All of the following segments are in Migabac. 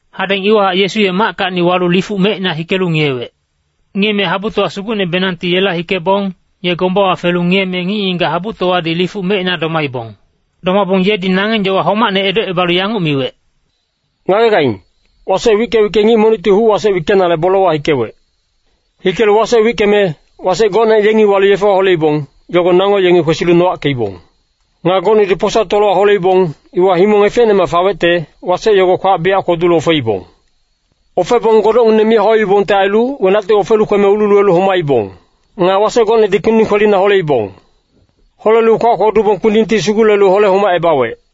Hadeng iwahac Yesu ye mackacni walu lifuc mecina hikelu ngiyewec. Ngiyeme habutowa sugucnebenangti yela hikebong, ye gombawa felu ngiyeme ngic-ngigac habutowadi lifuc mecina domaibong. Domabong yedi nangeng yowa homacne edocebalu yanguc miwec, “Ngagegaing, wasec wicke-wicke ngic monicti huc-wasec wickenale bolewa hikewec. Hikelu wasec wickeme, wasec gocne yengi walu yefewa holeibong, yogo nango yengi kwesilu nowackeibong. Nga gocnedi posa tolowa holeibong, iwa himong efecnemac fawecte, wasec yogo kwac biyac kwodulu ofeibong. Ofebong godocngineng mi hauibongte ailu, wenacti ofelu kweme ululuwelu homaibong. Nga wasec gocnedi kpinding kwelina holeibong. Holelu kwac kwodubong kpindingti sugulelu hole-homacebawec.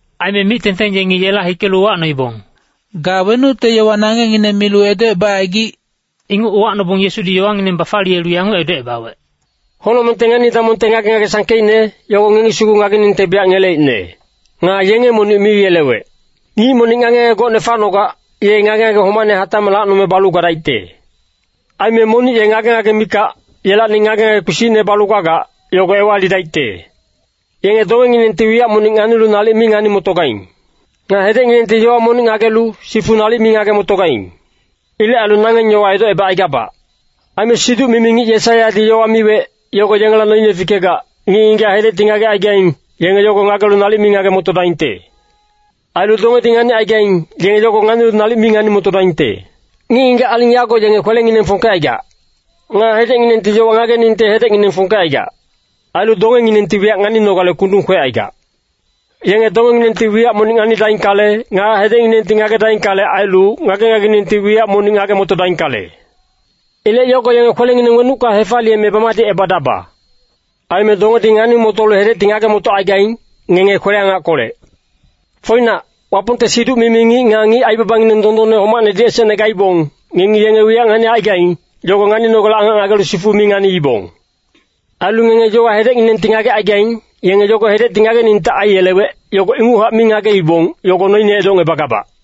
Aime mic-tengteng yengi yela hikelu uwacnoibong, “Ga wenucte yowa nangengngine milu edocebacaigic?” Inguc uwacnobong Yesudi yowangineng bafaliyelu yanguc edocebawec, “Honocmengte ngani-damongte ngage-ngage sangkeicne, yogo ngengi sugu ngageningte biyac ngeleicne. Nga yenge monic mi yelewec. Ngic monic ngage-ngage gocne facnogac, ye ngage-ngage homacne hatacmac lacnome balu gadaicte. Aime monic ye ngage-ngage mikac, yelacni ngage-ngage kpisicne balu gagac, yogo ewalidaicte. Yenge dongenginengti wiyac monic nganilu nalic mi ngani-motogaing. Nga hedecnginengti yowa monic ngagelu, sifu nalic mi ngage-motogaing. Ilec ailu nangeng yowa edocebacaigabac. Aime siduc-mimi ngic Yesaiyadi yowa miwec, yogo yengela noine fikegac, ‘Ngic-ngigac hedecti ngagecaigaing, yenge yogo ngagelu nalic mi ngage-motodaingte. Ailu dongedi nganicaigaing, yenge yogo nganilu nalic mi ngani-motodaingte. Ngic-ngigac aling yago yenge kwelengineng fongkecaigac. Nga hedecnginengti yowa ngageningte hedecngineng fongkecaigac. Ailu dongenginengti wiyac nganinogale kundung kwecaigac. Yenge dongenginengti wiyac monic nganidaingkale, nga hedecnginengti ngagedaingkale ailu, ngage-ngagenginengti wiyac monic ngage-motodaingkale. Ilec yogo yenge kwelengineng wenucka hefaliyeme bamadicebadaba.’ Aime dongedi ngani-motolu hedecti ngage-motocaigaing, ngenge kwele-angackolec. Foinac, Wapongte siduc-mimi ngic nga ngic aibabangineng dondonne homacnedi esecne gaibong, ngengi yenge wiyac nganicaigaing, yogo nganinogale angac ngagelu sifu mi nganiibong. Ailu ngenge yowa hedecnginengti ngagecaigaing, yenge yogo hedecti ngageningte aiyelewec, yogo inguchac mi ngageibong, yogo noine edocngebagabac.”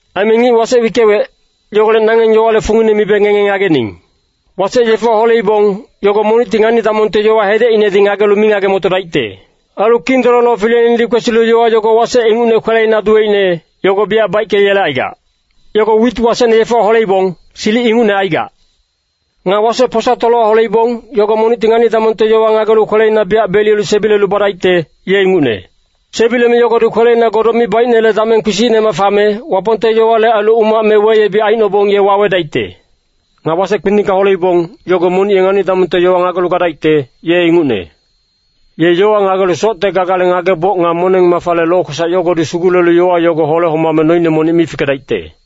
“Aime ngic wasec wickewec, yogolec nangeng yowale fungine mibe ngenge ngagening. Wasec yefewa holeibong, yogo monicti ngani-damongte yowa hedecinedi ngagelu mi ngage-motodaicte. Ailu Kindololo fileinedi kwesilu yowa yogo wasec ingucne kweleina duweicne, yogo biyac baickeyelecaigac. Yogo wit wasecne yefewa holeibong, silic ingucne aigac. Nga wasec posa tolowa holeibong, yogo monicti ngani-damongte yowa ngagelu kweleina biyac beliyelu sebilelu badaicte, ye ingucne. Sebileme yogodi kweleina godoc mi baicnele dameng kpisicnemac fame, Wapongte yowale ailu umac me weyebic aicnobong ye wawedaicte. Nga wasec kpindingka holeibong, yogo monic ye ngani-damongte yowa ngagelu gadaicte, ye ingucne. Ye yowa ngagelu socte gagale ngageboc nga moneng-mafale lokwesac yogodi sugulelu yowa yogo hole-homame noine monic mi fikedaicte.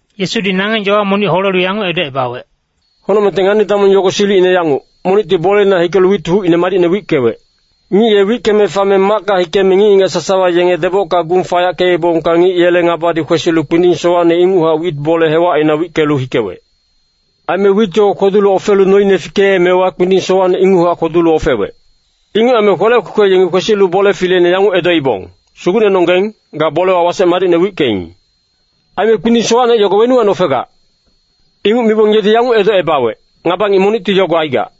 Yesudi nangeng yowa monic holelu yanguc edocebawec, “Honocmengte ngani-damong yogo silicine yanguc, monicti boleina hikelu wit hucine madicne wickewec. Ngic ye wickeme fame macka hikeme ngic-ngigac sasawa yenge debocka gung fayackeebongka ngic yele ngabadi kwesilu kpinding sowacne inguchac wit bole hewacina wickelu hikewec. Aime wit yogo kwodu ofelu noine fikeemewa kpinding sowacne inguchac kwodulu ofewec. “Inguc aime kwelec kwekwe yengi kwesilu bole fileine yanguc edoibong, ‘Sugucnenonggeng, ga bolewa wasec madicne wickeing. Aime kpinding sowacne yogo wenuwacni ofegac?’ “Inguc mibong yedi yanguc edocebawec, ‘Ngaba ngic monicti yogo aigac.’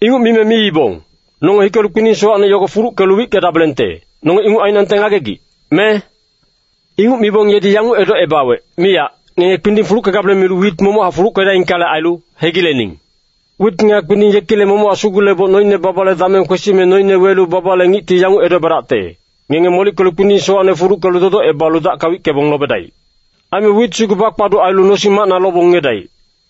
“Inguc mime miibong, ‘Nonge hikelu kpinding sowacne yogo fuluckelu wickedabelengte, nonge inguc ainangte ngagegic, me?’ “Inguc mibong yedi yanguc edocebawec, ‘Miyac, ngenge kpinding fuluckegabeleng milu wit momochac fuluckedaingkale ailu, hegilening. Wit nga kpinding yekilec momochac suguleboc noine babale dameng kwesime noine welu babale ngicti yanguc edocebadacte, “Ngenge molickelu kpinding sowacne fuluckelu dodocebalu dacka wickebong lobedaic. Aime wit sugu bakpaduc ailu nosing-macna lobong ngiyedaic.”’”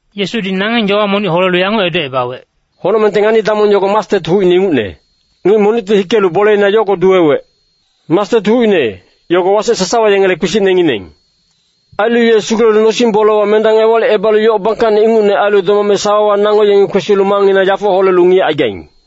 Yesudi nangeng yowa monic holelu yanguc edocebawec, “Honocmengte ngani-damong yogo mastet hucine ingucne. Ngic monicti hikelu boleina yogo duwewec. Mastet hucine, yogo wasec sasawa yengele kpisicnengineng. Ailu ye sugulelu nosing-bolewa mendang ewalicebalu yoc bangkacne ingucne ailu domame sawawa nango yengi kwesilu mangngina yafo holelu ngiyecaigaing.”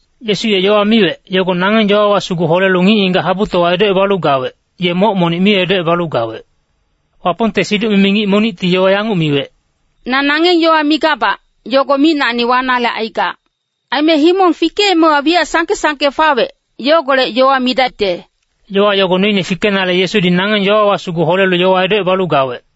Yesu ye yowa miwec, yogo nangeng yowawa sugu holelu ngic-ngigac habutowa edocebalu gawec, ye moc monic mi edocebalu gawec. Wapongte siduc-mimi ngic monicti yowa yanguc miwec, “Na nangeng yowa migabac, yogo micnacni wanale aigac. Aime himong fikeemewa wiyac sangke-sangke fawec, yogolec yowa midacte.” Yowa yogo noine fikenale Yesudi nangeng yowawa sugu holelu yowa edocebalu gawec.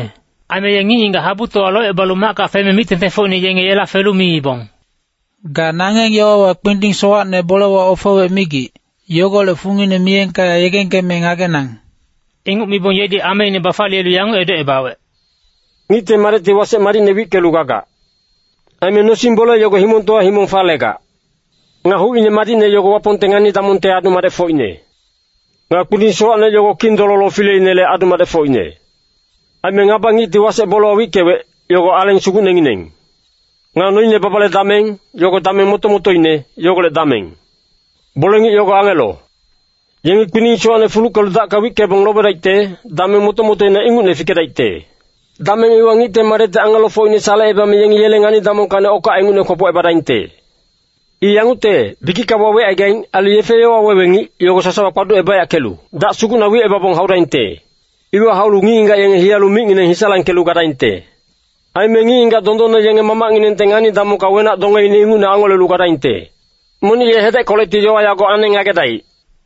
Aime ye ngic-ngigac habutowa locebalu macka feme mic-tengtengfocine yenge yela felu miibong, “Ga nangeng yowawa kpinding sowacne bolewa ofewec migic, yogolec fungine miyengka yegengkeme ngagenang.” Inguc mibong yedi ameine bafaliyelu yanguc edocebawec, “Ngicte Madecti wasec madicne wickelu gagac. Aime nosing-bole yogo himongtowa himong falegac. Nga hucine madicne yogo Wapongte ngani-damongte adu-madecfocine. Nga kpinding sowacne yogo Kindololo fileinele adu-madecfocine. Aime ngaba-ngicti wasec bolewa wickewec, yogo Aleng Sugucnengineng. Nga noine babale dameng, yogo dameng moto-motoine, yogolec dameng. Bole-ngic yogo angelo. Yengi kpinding sowacne fuluckelu dacka wickebong lobedaicte, dameng moto-motoina ingucne fikedaicte. Dameng iwa Ngicte Madecti angelofocine salecebame yengi yele ngani-damongkacni okac ingucne kwopocebadaingte. I yangucte, bikicka wawecaigaing, ailu yefe-yowa wewe ngic, yogo sasawa kpaducebayackelu dac sugucna wicebabong haudaingte. Iwa haulu ngic-ngigac yenge hiyalu micngineng hisalangkelu gadaingte. Aime ngic-ngigac dondonne yenge Mamacnginengte ngani-damongka wenac-dongeine ingucne angolelu gadaingte. Monic ye hedeckolecti yowa yago aneng ngagedaic.”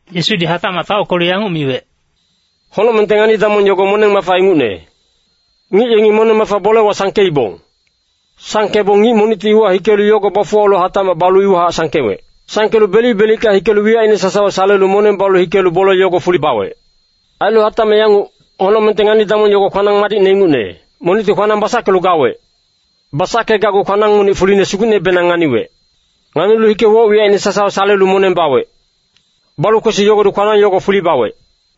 Yesudi hatacmac taockelu yanguc miwec, “Honocmengte ngani-damong yogo moneng-mafa ingucne. Ngic yengi moneng-mafa bolewa sangkeibong. Sangkebong ngic monicti iwa hikelu yogo bafuwalu hatacmac balu iwahac sangkewec. Sangkelu belic-belicka hikelu wiyacine sasawa salelu moneng balu hikelu bole yogo fuli bawec. “Ailu hatacmac yanguc, honocmengte ngani-damong yogo kwanang madicne ingucne. Monicti kwanang basackelu gawec. Basackegacgu kwanang monic fuline sugucnebenang nganiwec. Nganilu hike woc-wiyacine sasawa salelu moneng bawec. Balu kwesi yogodi kwanang yogo fuli bawec.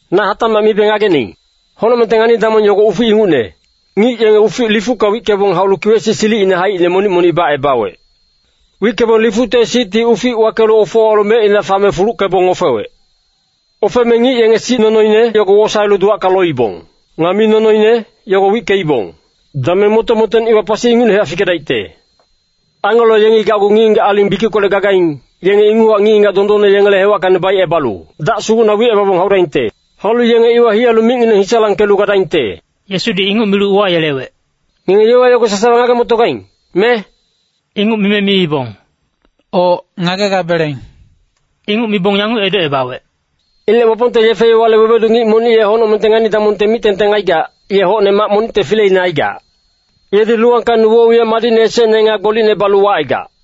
“Na hatacmac mibe ngagening. Honocmengte ngani-damong yogo ufic ingucne. Ngic yenge ufic lifucka wickebong haulu kiwec-sic silicine haicine monic-monic bacebawec. Wickebong lifucte sicti ufic wakelu ofowalu mecina fame fuluckebong ofewec. Ofeme ngic yenge sic nonoine yogo wosaelu duwacka loibong. Nga mi nonoine, yogo wickeibong. Dameng moto-motoine iwa pasi ingucnehac fikedaicte. Angelo yengi gacgu ngic-ngigac aling bikickolec gagaing, yenge inguchac ngic-ngigac dondonne yengele hewackacni baicebalu dac sugucna wicebabong haudaingte. Haulu yenge iwa hiyalu micngineng hisalangkelu gadaingte.” Yesudi inguc milu uwayelewec, “Ngenge yowa yogo sasawa ngage-motogaing, me?” Inguc mime miibong, “Oc, ngaegabeleng.” Inguc mibong yanguc edocebawec, “Ilec Wapongte yefe-yowale wewedu ngic monic ye honocmengte ngani-damongte mic-tengteng aigac, ye hocne mac monicte fileine aigac. Yedi luwangkacni woc-wiyac madicne esecne nga gbolicne balu wacaigac.”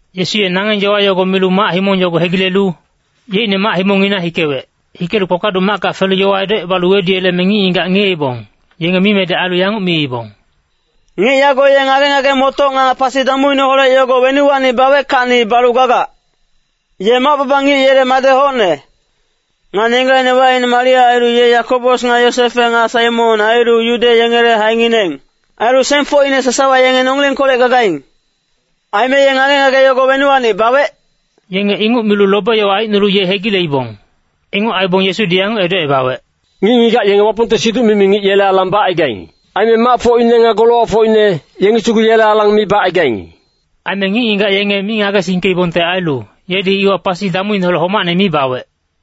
Yesu ye nangeng yowa yogo milu mac-himong yogo hegilelu yeicne mac-himongngina hikewec. Hikelu kpakpaduc macka felu yowa edocebalu weduyeleme ngic-ngigac ngiyeibong, yenge mimedec ailu yanguc miibong, “Ngic yago ye ngage-ngage-motoc nga pasi damuineholec yogo wenuwacni baweckacni balu gagac? Ye mac-baba ngic yele madec hocne. Nga nenggacine wacine Maria ailu ye Yakobos nga Yosefe nga Saimon ailu Yude yengele haengineng. Ailu sengfocine sasawa yenge nongilengkolec gagaing. Aime ye ngage-ngage yogo wenuwacni bawec?” Yenge inguc milu lobe-yowa aicnolu ye hegileibong. Inguc aibong Yesudi yanguc edocebawec, “Ngic-ngigac yenge Wapongte siduc-mimi ngic yele alang bacaigaing. Aime macfocine nga golowacfocine, yengi sugu yele alang mi bacaigaing.” Aime ngic-ngigac yenge mi ngagesingkeibongte ailu, yedi iwa pasi damuineholec homacne mi bawec.